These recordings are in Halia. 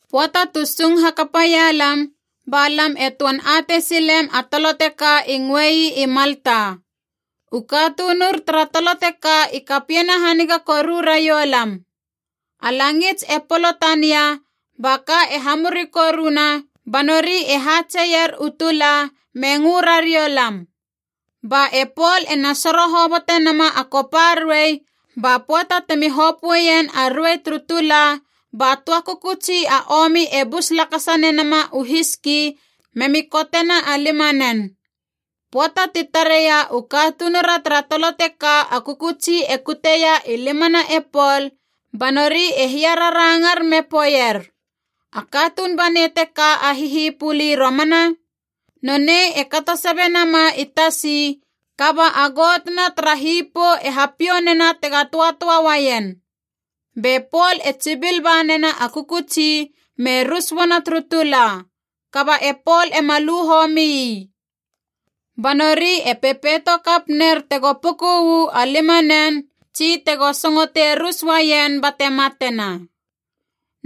Pöata tu sung hakapaia lam, ba lam e töan atei silem a tolo teka i ngöei i Malta. U katunur tara tolo teka i kapiena haniga koru raiou lam. A langits e polo tania ba ka e hamuri koruna, ba nori e hatseier u tula me ngö rariou lam. Ba e Pol ena soro hobotenama a kopa ruei, ba pöata temi hopöeien a rue turu tula ba töa kökötsi a omi e bus lakasa nenama u hiski memi kotena a limanen. Pöata ti tareia u katunura tara tolo teka a kökötsi e kuteia i limana e Pol, ba nori e hiararangar me poeier, “A katuun banei teka a hihipuli romana. Nonei e katosabe nama i tasi, kaba a got na tara hipou e hapiou nena tega töatöa uaien.” Be Pol e tsibil ba nena a kökötsi me rus uana turu tula, kaba e Pol ema lu homi ii. Ba nori e pepeito kap ner tego puku uu a limanen tsi tego singotei rus uaien bate matena.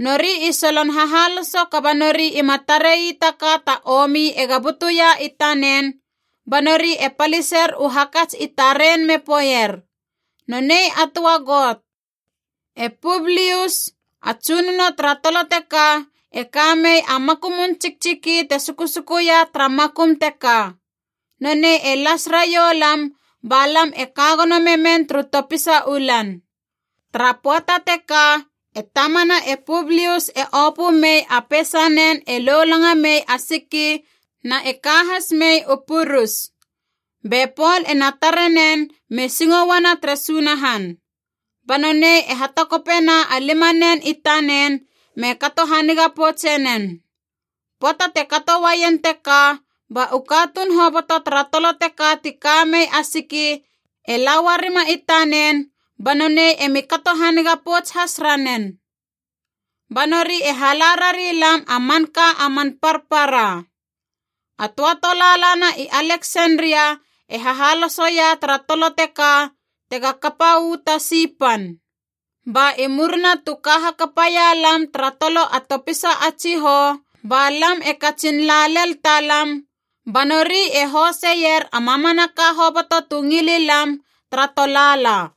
Nori i solon hahaloso kaba nori ima tarei ta ka ta omi ega butuia i tanen, ba nori e paliser u hakats i taren me poeier, “Nonei a töa got.” E Publius, a tsunono tara tolo teka, e ka mei a makumun tsiktsiki te sukusukuia tara makum teka. Nonei e las raioulam ba lam e ka gono memen turu topisa u lan. Tara pöata teka e tamana e Publius e opö mei a peisanen e lolanga mei a siki na e ka has mei u purus. Be Pol ena tare nen me singo uana tere Sunahan. Ba nonei e hatakopena a limanen i tanen me kato haniga poutse nen. Pöata te kato uaien teka ba u katuun hoboto tara tolo teka ti ka mei a siki e la uarima i tanen banonei emi kato haniga pouts has ranen. Ba nori e hala rari lam a manka a man parpara. A töa tolaalana i Aleksenria e hahalosoia tara tolo teka tega kapa uu tasi pan. Ba i murina tu ka hakapaia lam tara tolo a topisa a tsihou, ba lam e katsin la lel talam, ba nori e hoseier a mamanaka hoboto tu ngili lam, tara tolaala.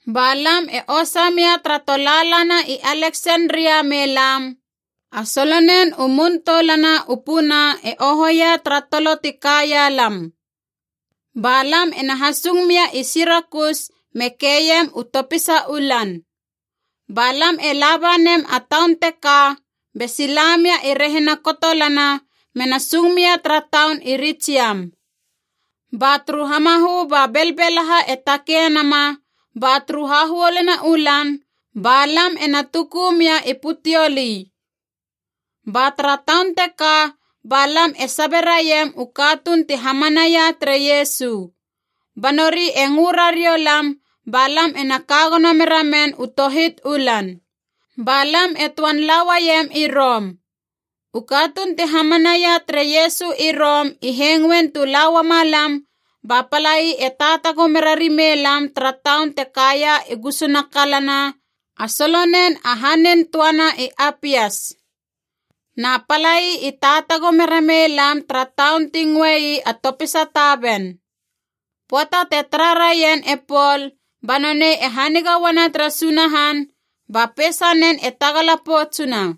Ba lam e osa mia tara tolaalana i Aleksenria me lam, a solonen u Mun Toulana u Puna e ohoia tara tolo ti kaia lam. Ba lam ena hasung mia i Sirakus me keiem u topisa u lan. Ba lam e laba nem a taun teka be sila mia i rehina kotolana mena sung mia tara taun i Ritsiam. Ba turu hamahö ba belbelahaa e takei nama, ba turu hahuoluna u lan ba lam ena tuku mia i Puteoli. Ba tara taun teka ba lam e saberaiam u katuun ti hamanaia tere Iesu. Ba nori e ngö rariou lam ba lam ena ka gono meramen u tohit u lan. Ba lam e töan la uaiem i Rom. U katuun ti hamanaia tere Iesu i Rom i hengoin tu la uama lam, ba palai e taatago mera rimei lam tara taun te kaia i gusuna kalana a solonen a Hanin Töana i Apias. Na palai i taatago mera mei lam tara taun ti ngöei a Topisa Taven. Pöata te tara raien e Pol ba nonei e haniga uana tere Sunahan ba peisanen e tagala poutsuna.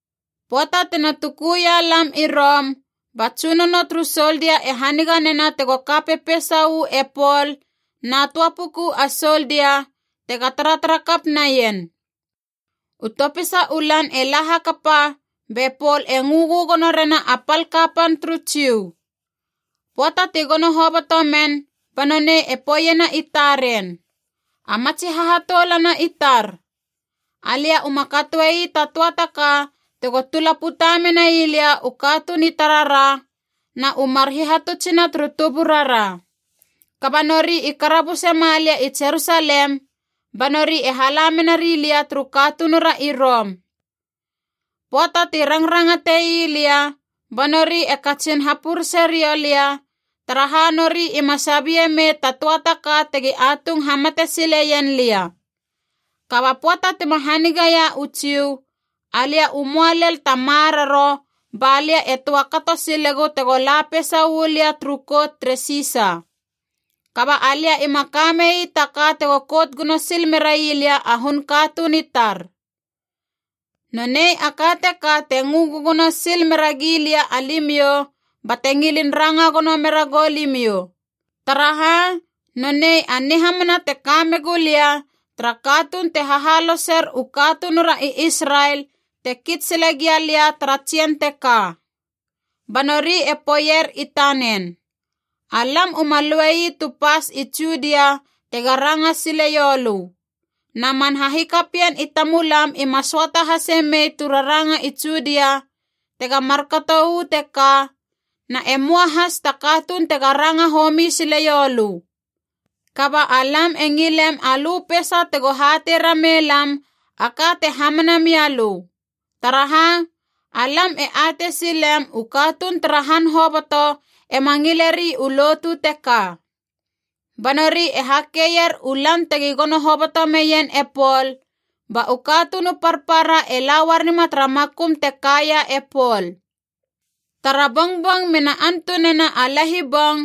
Pöata tina tukuia lam i Rom ba tsunono turu soldia e haniga nena tego ka pepeisa uu e Pol na töa puku a soldia, tega taratara kap naien. U topisa u lan e la hakapa be Pol e ngö gögono rena a pal kapan turu Jiu. Pöata ti gono hoboto men ba nonei e poeiena i taren, “A matsi hahatoulana i tar, alia uma katoei ta töa ta ka tego tula puta menai lia u katuun i tarara na u mar hihatutsina turu tuburara. Kaba nori i karabuse ma lia i Jerusalem, ba nori e hala mena rilia turu katunura i Rom. Pöata ti rangrangatei lia ba nori e katsin hapurese riou lia, taraha nori ima sabie mei ta töa ta ka tegi atung hamate sile ien lia. Kaba pöata tima haniga ia u Jiu, alia u möa lel ta maroro ba lia e töa kato silegu tego la peisa uu lia turu kout tere Sisa. Kaba alia ima ka mei ta ka tego kout gono sil merai lia a hun katuun i tar. Nonei a ka teka te ngö gögono sil mera gi lia alimiou bate ngilin ranga gono mera goulimiou. Taraha, nonei a nihamana te kame gulia tara katuun te hahaloser u katunura i Israel te kits sile gia lia tara tsien teka.” Ba nori e poeier i tanen, “Alam uma luei tu pas i Judia tega ranga sile ioulö. Na man hahikapien i tamulam ima söata hase mei tu rangana i Judia tega markato uu teka, na e möa has ta katuun tega ranga homi sileiou lö. Kaba alam e ngilem alö peisa tego hatei rameilam a ka te hamana mia lö. Taraha, alam e atei silem u katuun tara han hoboto ema ngileri u lotu teka.” Ba nori e hakeier u lan tegi gono hoboto meien e Pol, ba u katuun u parpara e la uarima tara makum te kaia e Pol. Tara bongbong mena antunena a lahibong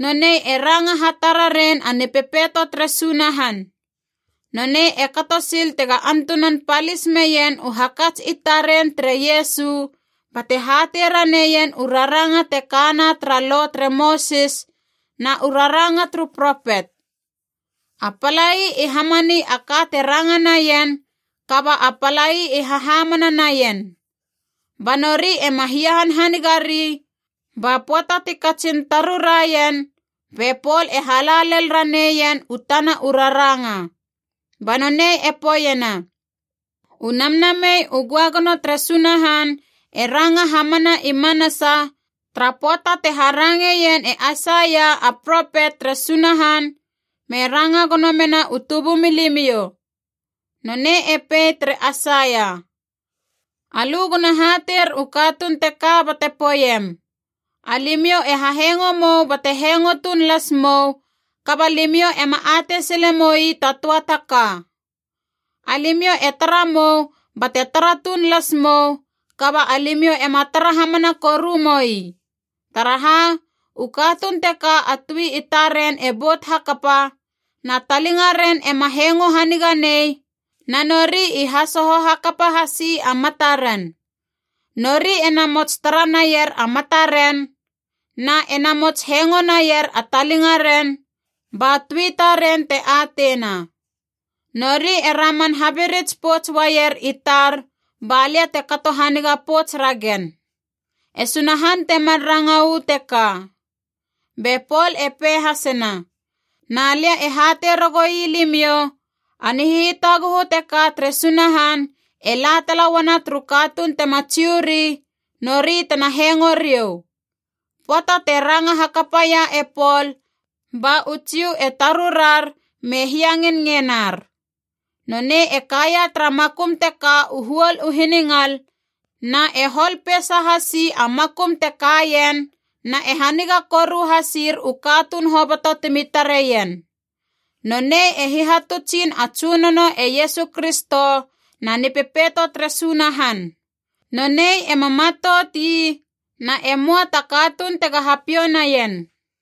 nonei e ranga hatararein a Nipepeito tere Sunahan. Nonei e kato sil tega antunan palis meien u hakats i taren tere Iesu, bate hatei raneien u raranga te kana tara Lo tere Mosis na u raranga turu propet. A palai i hamani a ka te ranga naien, kaba a palai i hahamana naien. Ba nori ema hiahanhaniga ri, ba pöata ti katsin taruraien be Pol e hala lel raneien ien u tana u raranga. Ba nonei e poeiena, “U Namnamei u Göagono tere Sunahan e ranga hamana i manasa tara pöata te harangeien e Aisaia a propet tere Sunahan me ranga gono mena u tubumilimiou. Nonei e pei tere Aisaia: ‘Alö gona hateir u katuun teka bate poeiem, Alimiou e hahengo mou bate hengo tuun las mou, kaba limiou ema atei sile moi ta töa ta ka. Alimiou e tara mou bate tara tuun las mou, kaba alimiou ema tara hamana koru moi. Taraha, u katuun teka a tui i taren e bout hakapa, na talingaren ema hengo haniga nei na nori i hasoho hakapa hasi a mataren. Nori e namots tara naier a mataren, na e namots hengo naier a talinga ren, ba tui taren te ateina. Nori e raman habirits pouts uaier i tar balia te kato haniga pouts ragen.’ “E Sunahan temar ranga uu teka.” Be Pol e pei hasena, “Na lia e hatei ragoui limiou, a nihitaguhu teka tere Sunahan e la tala uana turu katuun tema Jiu ri, nori tena hengo riou.” Pöata te ranga hakapa ia e Pol ba u Jiu e tarurar me hiangenngenar. Nonei e kaia tara makum teka u huol u hiningal na e hol peisa hasi a makum te kaien na e haniga koru hasir u katuun hoboto timi tareien. Nonei e hihatutsin a Tsunono e Iesu Kristo na Nipepeito tere Sunahan. Nonei ema matout ii, na e möa ta katuun tega hapiou naien.